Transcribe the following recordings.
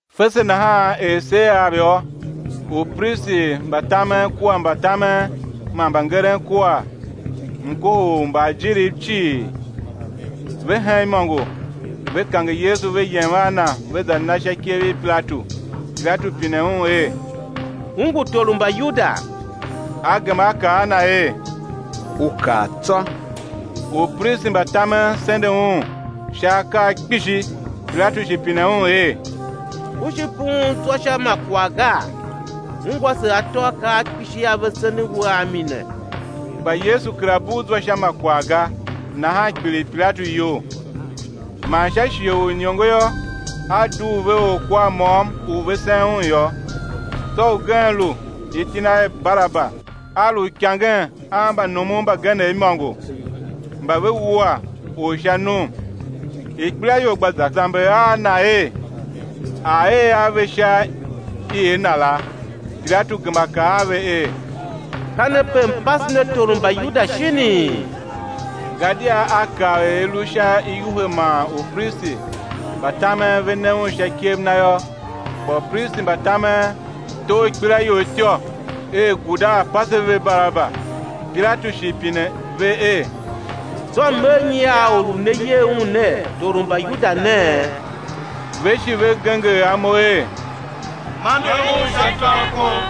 Fese nahan er sev av yô, upristi mba tamen kua mbatamen man mbangeren kua mkohol u mbaajiriv cii, ve hen imôngo, ve kange Yesu ve yem a Na, ve za na sha ikev i Pilatu. Pilatu pine Un er; U ngu tor u Mbayuda? A gema A kaa a na er: U kaa tsô. Upristi mba tamen sende Un sha akaa kpishi. Pilatu shi pine Un er: U shi bughun zwa sha ma kwagh gaa? Ungwa ase atôakaa kpishi a ve senden We a mi ne. Kpa Yesu kera bugh zwa sha ma kwagh ga, nahan kpiligh Pilatu iyol. Man sha shighe u iniongo yô, a dughun ve orkwar môm u ve sen un yô. Tsô ugen lu, iti na Baraba, a lu uikangen a mbanumuv mbagenev imôngo, mba ve wua or sha num. Ikpelaior gba za zamber a na er, a̱ er a ve sha ier na la. Pilatu gema kaa a ve er: Ka ne pe m̱ pase ne tor u Mbayuda shinii? Gadia a kav er i lu sha iwuhe man upristi mba tamen ve ne Un sha ikev na yô. Kpa upristi mba tamen tor ikpelaior ityô er, guda a̱ pase ve Baraba. Pilatu shi pine ve er: Tsô m̱ er nyi a Or u ne yer Un ner tor u Mbayuda nee? Ve shi ve genger amo er: Mande Un sha terankon!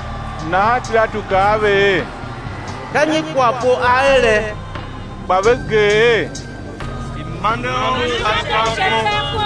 Nahan Pilatu, kaa a ve er: Ka nyi kwaghbo A ere? Kpa ve ger er: I̱ mande Un sha terankon!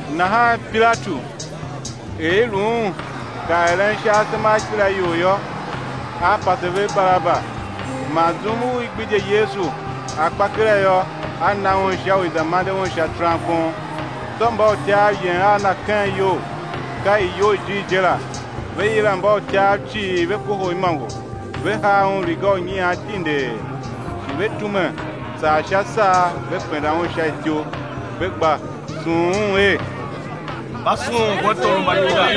Nahan Pilatu, er i lu un ka eren sha asema a ikpelaior yô, a pase ve Baraba; man zum u i gbidye Yesu akpa kera yô, a na Un sha u i̱ za mande Un sha terankon. Tsô mbautyav yem, a Na ken iyou, ka iyoujir je la, ve yila mbautyav cii, va kohol imôngo. Ve haa Un riga u nyian dindee; shi ve tume tsar sha saa ve penda Un sha ityou. Ve gba sughun Un er: Mba sughun We, tor u Mbayuda!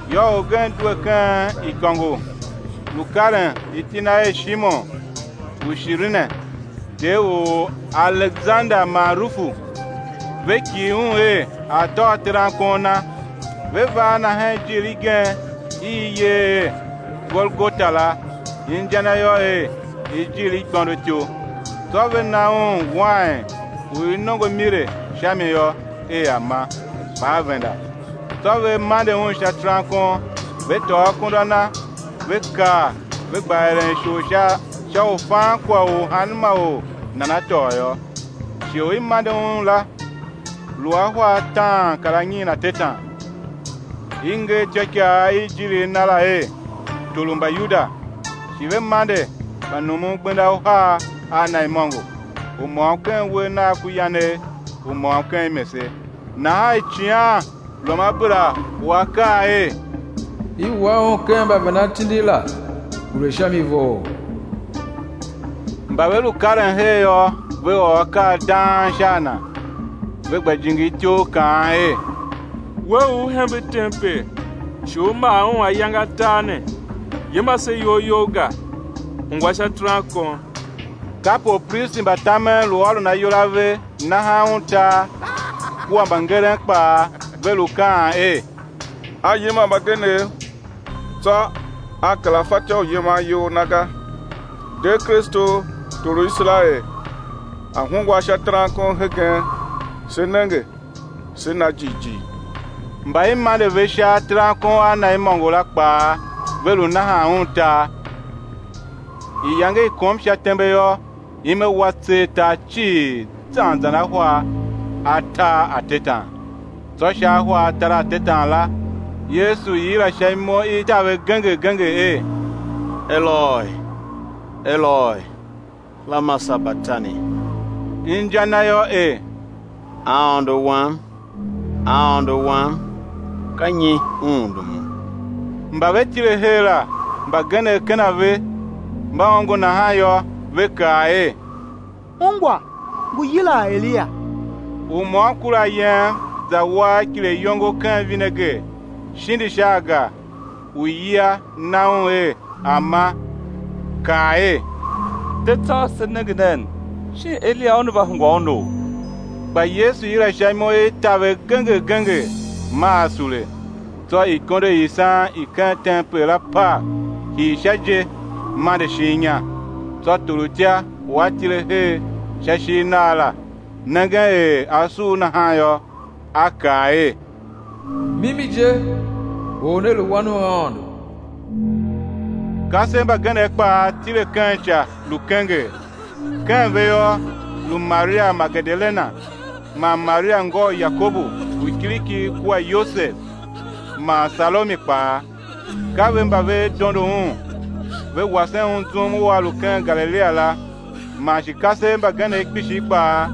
Yô, orgen due ken ikôngo lu karen, iti na er Shimon u Shirene, ter u Alekesander man Rufu, ve kighir un er a̱ tôô terankon Na. Ve va a na hen ijiir igen i i yer er Golgota la, inja na yô er, ijiir i gbôndotyou. Tsô ve na Un wain u i nongo mire sha mi yô, er A̱ ma, kpa A venda. Tsô ve mande Un sha terankon, ve tôô akondo a na ve kar, ve gba eren ishor sha a, sha u fan kwagh u hanma or nana tôô yô. Shighe u i mande Un la, lu ahwa ataankaranyiin atetan. I nger ityôikaa i ijirigh Na la er: Tor u Mbayuda. Shi ve mande mbanumungbenda uhar a na imôngo, u môm ken uwegh Nagh ku yanegh, u môm ken imese. Nahan icighanruamabera u a kaa er: I wa Un ken mbavendan atindi la, kure sha mi vough. Mba ve lu karen her yô, ve ôr akaa a dang sha a Na, ve gba jingir ityouv, kaan er: We u U hembe tempel, shi U maa un ayange atar ne, yima ase iyol You ga! Hungwa sha terankon! Kape upristi mba tamen lu ôron ayol a ve, nahan Un tar, kua mbangeren kpaa, ve lu kaan er, A yima mbagenev, tsô A kera fatyô u yiman iyol Na ga. De, Kristu, Tor u Iserael, A̱ hungwa sha terankon hegen, se̱ nenge, se̱ na jighjigh. Mba i mande ve sha terankon a Na imôngo la kpaa, ve lu nahan Un tar. Iyange i kom sha tembe yô, ime wa tser tar cii zan zan ahwa atar atetan. Tsô sha ahwa atar atetan la, Yesu yila sha imo i taver genger genger er: Eloi, Eloi, Lama Sabatani! Inja na yô, er: Aôndo Wam, Aôndo Wam, ka nyi U undumu? Mba ve tile her la, mbagenev ken a ve mba ongo nahan yô, ve kaa er: Ungwa, ngu yilan Eliya. U môm kura ayem, za wa kileyongo ken vineger, shindi sha aga u iyia, na Un er A̱ ma, kaa er: De tsô, se nenge nen shin Eliya una va hungwa Unou? Kpa Yesu yila sha imo i taver genger genger maa A sule. Tsô ikondo i yisan i ken tempel la pav hii sha je, mande shin inya. Tsô torutya u a tile her sha ishigh Nagh la, nengen er A sur nahan yô, a kaa er: Mimi je, Or ne lu Wan u Aôndo. Kasev mbagenev kpaa tile ken ica lu kenger; ken ve yô, lu Maria Magedalena man Maria ngô u Yakobu u kiriki kua Yose, man Salome kpaa. Ka ve mba ve dondo Un, ve wasen Un zum u A lu ken Galilia la; man shi kasev mbagenev kpishi kpaa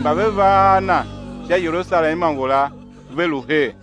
mba ve va a Na sha Yerusalem imôngo la, ve lu her.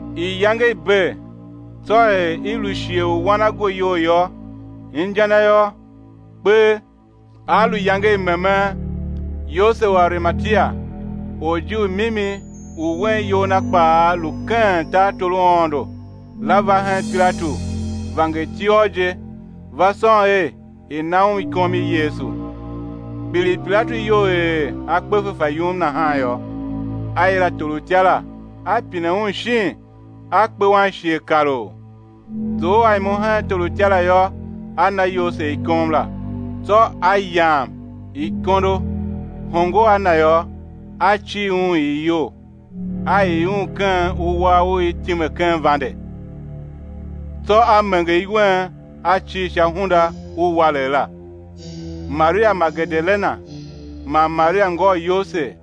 Iyange i bee, tsô er i lu shighe u wan ago iyol yô, inja na yô, kper á lu iyange i memen Yosev u Arimatia, orjir u mimi, u wen iyol na kpaa lu keghen tartor u Aôndo la va hen Pilatu vangertiôr je, va sôn er, i̱ na un ikom i Yesu. Kpiligh Pilatu iyol er A kpe fefa yum nahan yô; a yila torutya la, a pine un, shin A kpe anshighe karou? Zough a imo hen torutya la yô, a na Yosev ikom la. Tsô a yam ikondo, hongo a Na yô, a cir Un i iyol, a ii Un ken uwar u i time ken vande; tsô a menger iwen a cir sha hunda u uwaregh la. Maria Magedalena man Maria ngô u Yosev,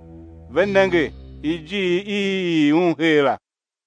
ve nenge ijiir i i ii Un her la.